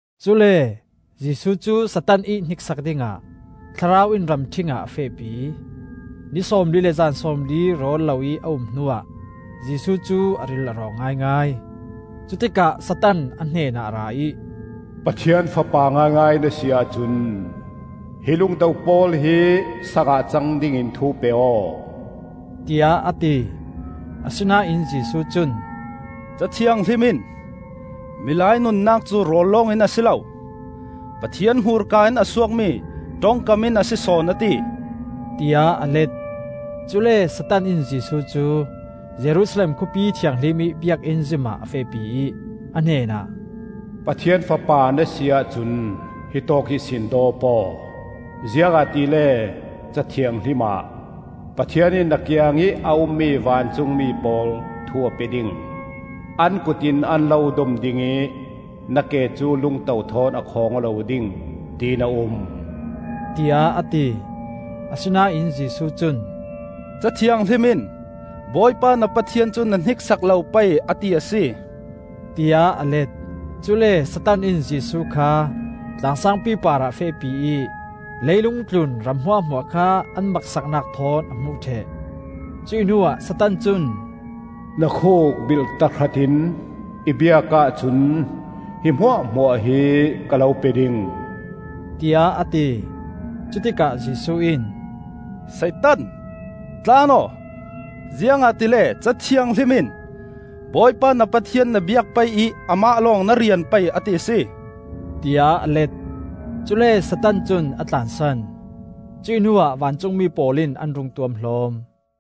Cule Jesuh cu Satan ih hniksak dingah Thlarau in ramṭhing ah a fehpi. Ni sawmli le zan sawmli rawl loih a um hnuah Jesuh cu a ril a rawng ngaingai. Cutikah Satan a hnenah a ra ih, “Pathian Fapa ngaingai na si ahcun hi lungto pawl hi saang ah cang dingin thu pe aw,” tiah a ti. Asinain Jesuh cun, “Ca Thianghlim in ‘Milai nunnak cu rawl lawngin a si lo. Pathian hmurka in a suakmi ṭongkam in a si sawn,’ a ti,” tiah a let. Cule Satan in Jesuh cu Jerusalem Khawpi Thianghlim ih Biakinn zim ah a fehpi ih, a hnenah, “Pathian Fapa na si ahcun hitawk ihsin dawp aw, ziangahtile Ca Thianghlim ah, ‘Pathian in na kiangih a ummi vancungmi pawl thu a pe ding, An kut in an lo dom ding ih na ke cu lungto thawn a khawng aw lo ding,’ tin a um,” tiah a ti. Asinain Jesuh cun, “Ca Thianghlim in ‘Bawipa na Pathian cu na hniksak lo pei,’ a ti a si,” tiah a let. Cule Satan in Jesuh kha tlang saangpi parah a fehpi ih leilung tlun ram hmuahhmuah kha an maksaknak thawn a hmuh ṭheh. Cuih hnuah Satan cun, “Na khuk bilh tahratin i biak ahcun hi hmuahhmuah hi ka lo pe ding,” tiah a ti. Cutikah Jesuh in, “Satan, tlan aw, ziangahtile Ca Thianghlim in ‘Bawipa na Pathian na biak pei ih amah lawng na rian pei,’ a ti a si,” tiah a let. Cule Satan cun a tlansan; cuih hnuah vancungmi pawl in an rung tuamhlawm.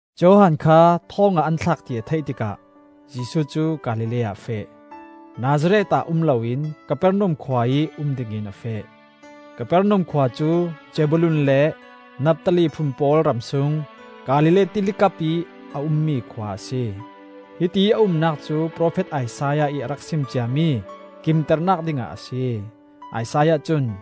Johan kha thawng ah an thlak ti a theih tikah Jesuh cu Galilee ah a feh. Nazareth ah um loin Kapernaum khua ih um dingin a feh. Kapernaum khua cu Zebulun le Naftali phun pawl ram sung Galilee Tili kapih a ummi khua a si. Hitiih a umnak cu profet Isaiah ih a rak sim ciami kimternak dingah a si. Isaiah cun: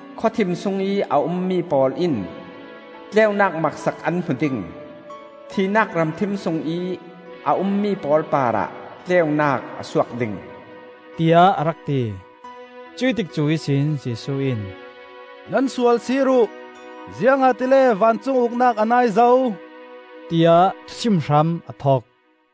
Khawthim sungih a ummi pawl in, Tleunak maksak an hmu ding. Thihnak ram thim sungih a ummi pawl parah tleunak a suak ding,” tiah a rak ti. Cuih tikcu ihsin Jesuh in, “Nan sual sir uh, ziangahtile vancung Uknak a nai zo,” tiah thusim hram a thok.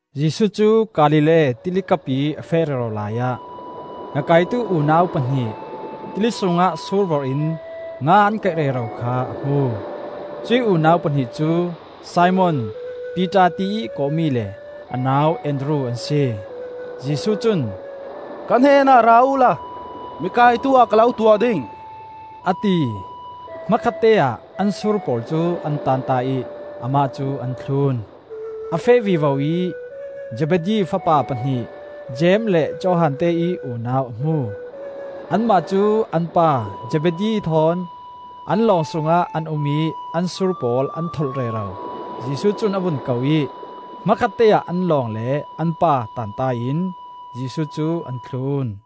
Jesuh cu Galilee Tili kapih a feh rero laiah ngakaitu unau pahnih, tili sungah sur vorh in nga an kaih rero kha a hmu. Cuih unau pahnih cu Simon (Piter tiih kawhmi) le a nau Andru an si. Jesuh cun, “Ka hnenah ra uhla mikaitu ah ka lo tuah ding,” a ti. Hmakhatteah an sur pawl cu an tanta ih amah cu an thlun. A feh vivo ih Zebedi fapa pahnih Jeim le Johan teih unau a hmu. Anmah cu an pa Zebedi thawn an lawng sungah an um ih an sur pawl an tholh rero. Jesuh cun a vun ko ih, hmakhatte ah an lawng le an pa tanta in Jesuh cu an thlun.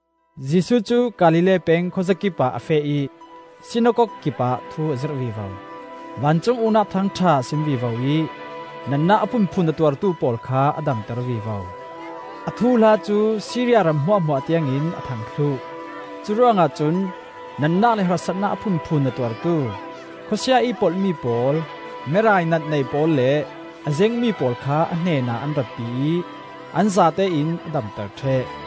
Jesuh cu Galilee peng khuazakip ah a feh ih sinakok kipah thu a zirh vivo. Vancung Uknak Thuthang ṭha a sim vivo ih natnak a phunphun a tuartu pawl kha a damter vivo. A thuhla cu Siria ram hmuahhmuah tiangin a thang thluh; curuangah cun natnak le harsatnak a phunphun a tuartu, khawsia-ih polhmi pawl, merainat nei pawl le a zengmi pawl kha a hnenah an ratpi ih an zate in a damter ṭheh.